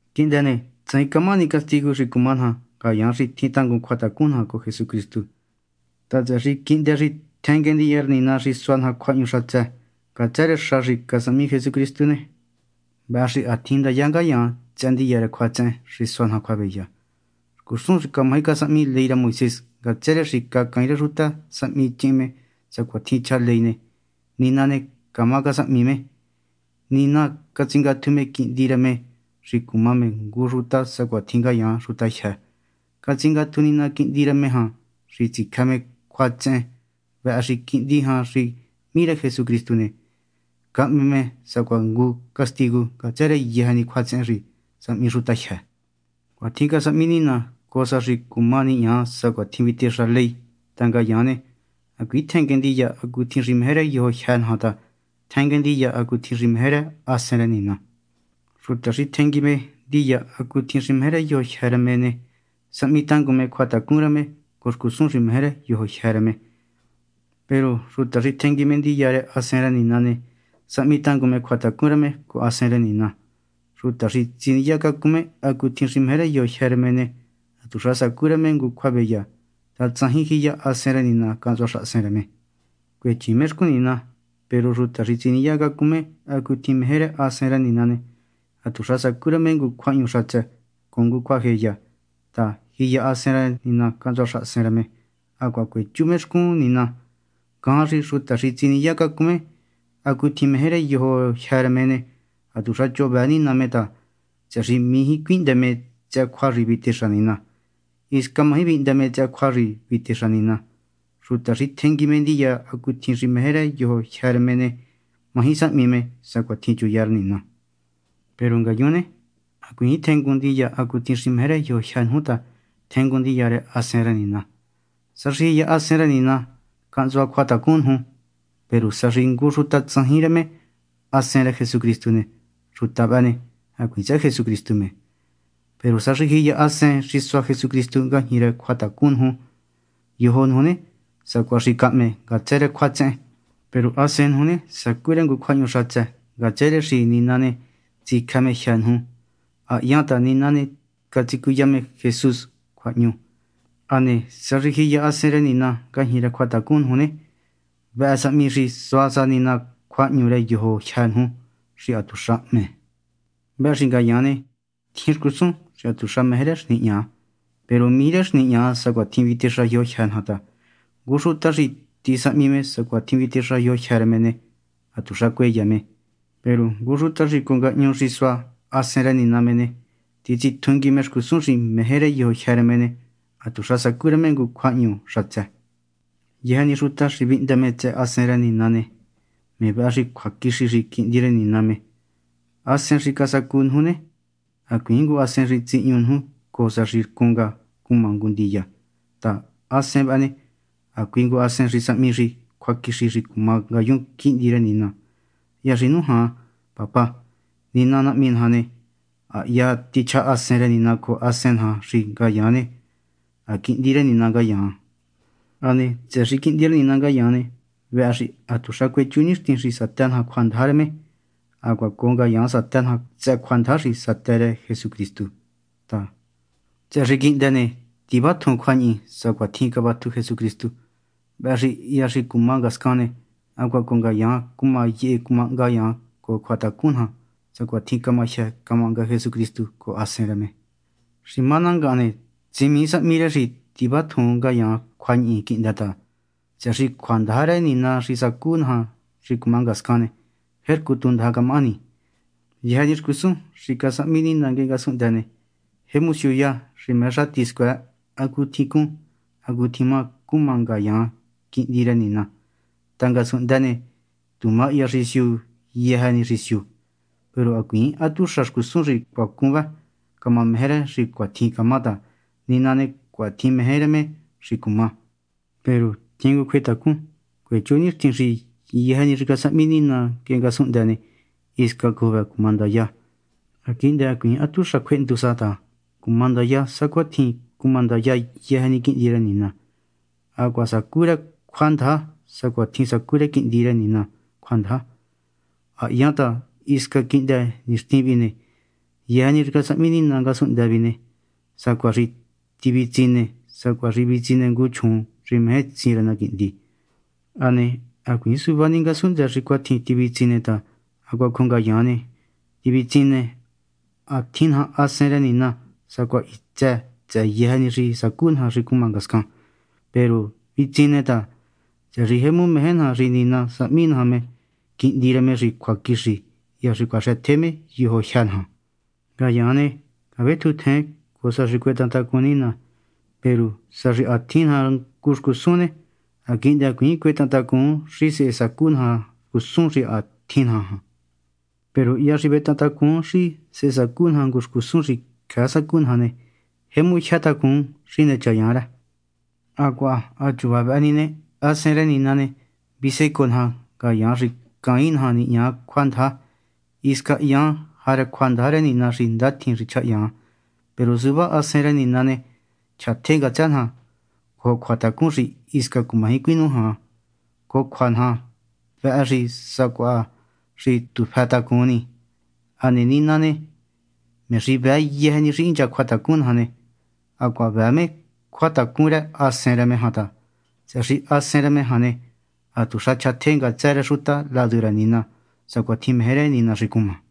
Quihndë ne, tsajin camahani castigu xi cuma naja ngayaan xi tjin tangun cjuatacun naja cojo Jesucristu ta, tsëhë xi quihndë xi tjenguen ndiya rë Nina xi sua naja cjuahñu xatsë ngatsë rë xa xi casahmi Jesucristu ne, vëhë xi ha tjin ndaya ngayaan tsëhë ndiya rë cjuatsehen xi sua naja cjuaveya. Xcusun xi camaji casahmi ley rë Moisés ngatsë rë xi caain rë xutajyë sahmi chihin me sacuatjin chja ley ne, Nina ne, camá casahmi me. Nina catsingatju me Quihndi rë me xi cuma me ngu xuta sacuatjin ngayaan xutajyë. Catsingatju Nina Quihndi rë me jan xi tsicjë me cjuatsehen. Vëhë xi quihndi jan xi hmí rë Jesucristu ne, cahme me sacuaha castigu ngatsë rë yëjë ni cjuatsehen xi sahmi xuta jyë́. Cuatjin casahmi Nina cojo sa xi cuma nihña sacuatjin vitexa ley ta ngayaan ne, hacuiin tjenguen ndiya hacutjin xi meje rë yojo jyë́ naja ta tjenguen ndiya hacutjin xi meje rë Hasen rë Nina. Xuta xi tjengui me ndiya hacutjin xi meje rë yojo jyë́ rë me ne, sahmi tangun me cjuatacun rë me cojo xcusun xi meje rë yojo jyë́ rë me. Peru xuta xi tjengui me ndiya rë Hasen rë Nina ne, sahmi tangun me cjuatacun rë me cojo Hasen rë Nina. Xuta xi tsiniya cacun me hacutjin xi meje rë yojo jyë́ rë me ne, hatuxa sacú rë me ngu cjuaveya ta tsajin jiya Hasen rë Nina cahntsua xahasen rë me, cuechiin me xcun Nina. Peru xuta xi tsiniya cacun me hacutjin meje rë Hasen rë Nina ne, hatuxa sacú rë me ngu cjuahñu xatsë cojo ngu cjuajeya ta ha jiya Hasen jan xahasen rë me hacuaha cuechú me xcun Nina. Ngajan xi xuta xi tsiniya cacun me hacutjin xi meje rë yojo jyë́ rë me ne, hatuxa choho vëë me Nina ta, tsëhë xi mijí cuihndë me tsëhë cjua xi vitexa Nina. Hisca maji vihndë me tsëhë cjua xi vitexa Nina. Xuta xi tjengui me ndiya hacutjin xi meje rë yojo jyë́ rë me ne, maji sahmi me sacuatjin chuya rë Nina. Peru ngayun ne, hacuiin tjengun ndiya hacutjin xi meje rë yojo jyë́ nuju ta tjengun ndiya rë Hasen rë Nina, sa xi jiya Hasen rë Nina cahntsua cjuatacun nuju. Peru sa xi ngu xuta tsajin rë me Hasen rë Jesucristu ne, xuta vëhë ne, hacuiin tsëhë Jesucristu me. Peru sa xi jiya Hasen xi sua Jesucristu ngajñi rë cjuatacun nuju ne, yojo nuju ne, sacuaha xi cahme ngatsë rë cjuatsehen, peru hasen nuju ne, sacú rë ngu cjuahñu xatsë ngatsë rë xi Nina ne, tsicjë me jyë́ nuju. Ha hyan ta Nina ne, catsicuya me Jesús cjuahñu. Hane sa xi jiya Hasen rë Nina ngajñi rë cjuatacun nuju ne, vëhë sahmi xi sua sa Nina cjuahñu rë yojo jyë́ nuju xi hatuxa hme. Vëhë xi ngayaan ne, tjin xcusun xi hatuxa meje rë xi nihña, peru mijí rë xi nihña sacuatjin vitexa yojo jyë́ naja ta ngu xuta xi tisahmi me sacuatjin vitexa yojo jyë́ rë me ne, hatuxa cueya me. Peru ngu xuta xi cojo ngahñu xi sua Hasen rë Nina me ne, titsitjungui me xcusun xi meje rë yojo rë me ne, hatuxa sacú rë me ngu cjuahñu xatsë. Yëjë ni xuta xi vihndë me tsëhë Hasen rë Nina ne, me vëhë xi cjuaquixi xi quihndi rë Nina me. Hasen xi casacu nuju ne, hacuiin ngu hasen xi tsihñu nuju cojo sa xi rcun nga cuma ngu ndiya ta, hasen vëhë ne, hacui ngu xi sahmi xi cjuaquixi xi cuma ngayun quihndi rë Nina. Hya xi nujan “¡Papá!” Nina Nahmi naja ne, hya tichja Hasen rë Nina cojo hasen naja xi ngayaan ne, ha quihndi rë Nina ngayaan. Hane tsëhë xi quihndi rë Nina ngayaan ne, vëhë xi hatuxa cuechú nixtin xi satë naja cjuandaja rë me. Hacuaha cojo ngayaan satë naja tsëhë cjuandaja xi satë rë Jesucristu ta, tsëhë xi quihndë ne, tivatjun cjuañihi sacuatjin cavatju Jesucristu. Vëhë xi hya xi cuma ngascan ne, hacuaha cojo ngayaan cuma yehe cuma hnga ngayaan cojo cjuatacun naja sacuatjin cama jyë cama hnga Jesucristu cojo Hasen rë me. Xi má ná ngahan ne, tsimii sahmi rë xi tivatjun ngayaan cjuañihi quihndë ta, tsëhë xi cjuandaja rë Nina xi sacú naja xi cuma ngascan ne, jercu tu ndaja camahani. Yëjë ni xcusun xi casahmi Nina nguehe ngasunhndë ne, jemu siuya xi meje xati scuëë hacutjin cún hacutjin má cuma ngayaan quihndi rë Nina. Ta ngasunhndë ne, tu mahya xi siu yëjë ni xi siu. Peru hacuiin hatuxa xcusun xi cacún vë camameje rë xi cuatjin camá ta Nina ne, cuatjin meje rë me xi cuma. Peru tjin ngu cjuetacun. Cuechú nixtin xi yëjë ni xi casahmi Nina nguehe ngasunhndë ne, hisca cojo vëhë cuma ndaya ne, ha quihndë hacuiin hatuxa cjuehndu sa ta cuma ndaya sacuatjin cuma ndaya yëjë ni quihndi rë Nina. Hacuaha sacú rë cjuandaja sacuatjin sacú rë quihndi rë Nina cjuandaja. Ha hyan ta hisca quihndë nixtin vihi ne, yëjë ni xi casahmi Nina ngasunhndë vi ne, sacuaha xi tivitsine sacuaha xi vitsine ngu chjuun xi meje tsin rë na quihndi. Hane hacuiin suvá ni ngasunhndë xi cuatjin tivitsine ta hacuaha cojo ngayaan ne, tivitsine. Ha tjin naja Hasen rë Nina sacuaha hitsë tsëhë yëjë ni xi sacú naja xi cuma ngascan. Peru vitsine ta, tsëhë xi jemu meje naja xi Nina sahmi naja me quihndi rë me xi cjuaquixi hya xi cuaxëtje me yojo jyë́ naja. Ngayaan ne, cavetjuntjen cojo sa xi cuetahan tacun Nina. Peru sa xi ha tjin naja ngu xcusun ne, ha quihndë hacuiin cuetahan tacun xi sehe sacú naja xcusun xi ha tjin naja jan. Peru hya xi vetahan tacun xi sacú naja ngu xcusun xi cjëë sacú naja ne, jemu jyë tacun xi nechayan rë. Hacuaha ha chuva vëhë ni ne, Hasen rë Nina ne, visecoo naja, ngayaan xi caain naja nihña cjuandaja. Hisca hyaan jarë cjuandaja rë Nina xi ndatjin xi chjahyan. Peru suvá Hasen rë Nina ne, chjatje ngatsë naja cojo cjuatacun xi hisca cumaji cuinújan cojo cjua naja. Vëhë xi sacuaha xi tu fëtacun ni. Hane Nina, me xi vëë yëjë ni xi hincha cjuatacun naja ne, hacuaha vëë me cjuatacun rë Hasen rë me jan ta, tsëhë xi Hasen rë me jan ne, hatuxa chjatje ngatsë rë xuta ladu rë Nina sacuatjin meje rë Nina xi cuma.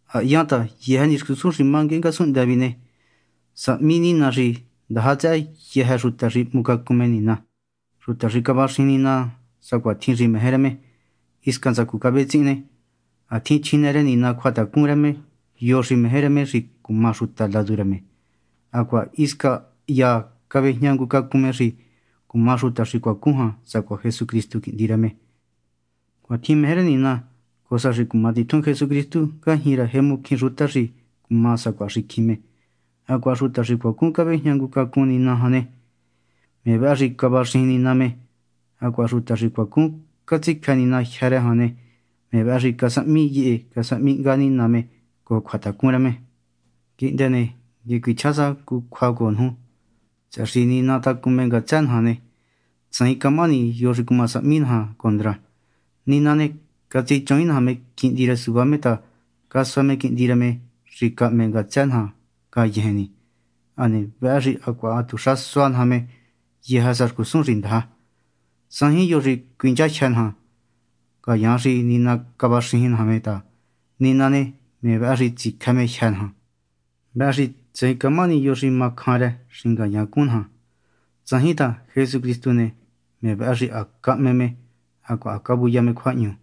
Ha hyan ta yëjë ni xcusun xi má nguehe ngasunhndë vi ne, sahmi Nina xi ndaja tsëhë xuta xi hmucacun me Nina, xuta xi cavaxijin Nina sacuatjin xi meje rë me. Hisca ntsacu cavetsihin ne, ha tjin chjinë rë Nina cjuatacun rë yo xi meje rë me xi cuma xuta ladu rë me, hacuaha hisca hya cavejña ngu cacun me xi cuma xuta xi cuacun jan sacuaha Jesucristu Quihndi rë me. Cuatjin meje rë Nina cojo sa xi cuma titjun Jesucristu ngajñi rë jemu cjín xuta xi cuma sacuaha xicjin me. Hacuaha xuta xi cuacun cavejña ngu cacun Nina jan ne, me vëhë xi cavaxijin Nina me; hacuaha xuta xi cuacun catsicjë Nina jyë́ rë jan ne, me vëhë xi casahmi yehe casahmi hnga Nina me cojo cjuatacun rë me. Quihndë ne, nguehe cuichjá sa ngu cjua cojo nuju. Tsëhë xi Nina tacun me ngatsë naja ne, tsajin camahani yo xi cuma sahmi naja condra. Nina ne, catsichuvaain naja me Quihndi rë suvá me ta casua me Quihndi rë me xi cahme ngatsë naja ngayejen ni. Hane vëhë xi hacuaha hatuxa sua naja me yëjë sa xcusun xi ndaja. Tsajin yo xi cuinchajyë naja, ngayaan xi Nina cavaxijin naja me ta, Nina ne, me vëhë xi tsicjë me jyë́ naja. Vëhë xi tsajin camahani yo xi ma cjan rë xi ngayaan cún naja. Tsajin ta, Jesucristu ne, me vëhë xi ha cahme me hacuaha ha cavuya me cjuahñu,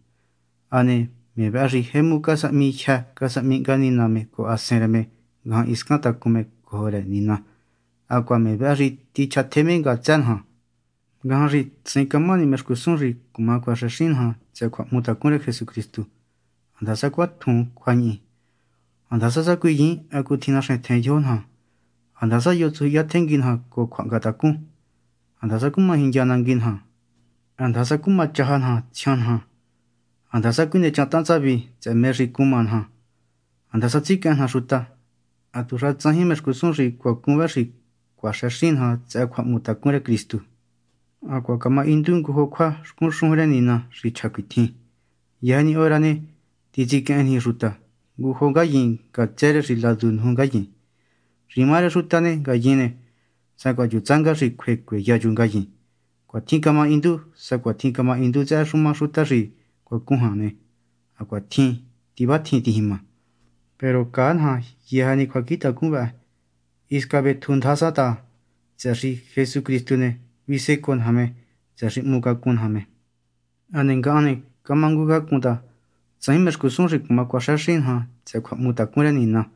hane me vëhë xi jemu casahmi jyë casahmi hnga Nina me cojo Hasen rë me ngajan hiscan tacun me cojo rë Nina. Hacuaha me vëhë xi tichjatje me ngatsë naja. Ngajan xi tsajin camahani mé xcusun xi cuaxëxin naja tsëhë cjuahmutacun rë Jesucristu, handasa cuatjun cjuañihi, handasa sacuiyiin hacutjin naxentjen yojo naja, handasa yo tsujyihiya tjengui naja cojo cjuahngatacun, handasa cuma jindya nangui naja, handasa cumachaja naja tsjian naja, handasa cuinechantahan tsavi xi mé xi cuma naja, handasa tsiquehen naja xuta. Hatuxa tsajin mé xcusun xi cuacun vë xi cuma cuaxëxin naja tsëhë cjuahmutacun rë Jesucristu. Hacuaha camahindu ngujo cjua xcun xujun rë Nina xi chja cuitjin: Yëjë ni hora ne, titsiquehen niji xuta ngu jo ngayin ngatsë rë xi ladu nuju ngayin; xi má rë xuta ne, ngayin ne, sacuaha chu tsánga xi cjue cueya chu ngayin. Cuatjin camahindu. Sacuatjin camahindu tsëhë xuma xuta xi cuacun jan ne, hacuaha cuatjin tivatjun tijima. Peru caa naja yëjë ni cjuacjintacun vëhë, hisca vetjun ndaja sa ta, tsëhë xi Jesucristu ne, visecoo naja me, tsëhë xi hmucacun naja me. Hane ngahan ne, camangucácun ta tsajin mé xcusun xi cuma cuaxëxin naja tsëhë cjuahmutacun rë Nina: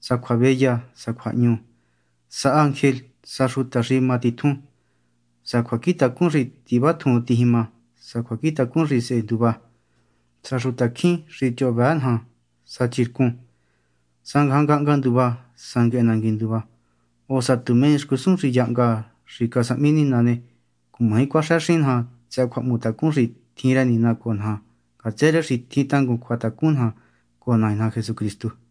sa cjuaveya sa cjuahñu, sa ángel sa xuta xi ma titjun, sa cjuacjintacun xi tivatjun tijima, sa cjuacjintacun xi sehe nduva, sa xutacjín xi choho vëë naja sa chircun, sa ngajan ngahnga nduva, sa nguehe nangui nduva, o sa tu mé ni xcusun xi yahnga xi casahmi Nina ne, cumaji cuaxëxin naja tsëhë cjuahmutacun xi tjin rë Nina cojo naja ngatsë rë xi tjin tangun cjuatacun naja cojo Nai naja Jesucristu.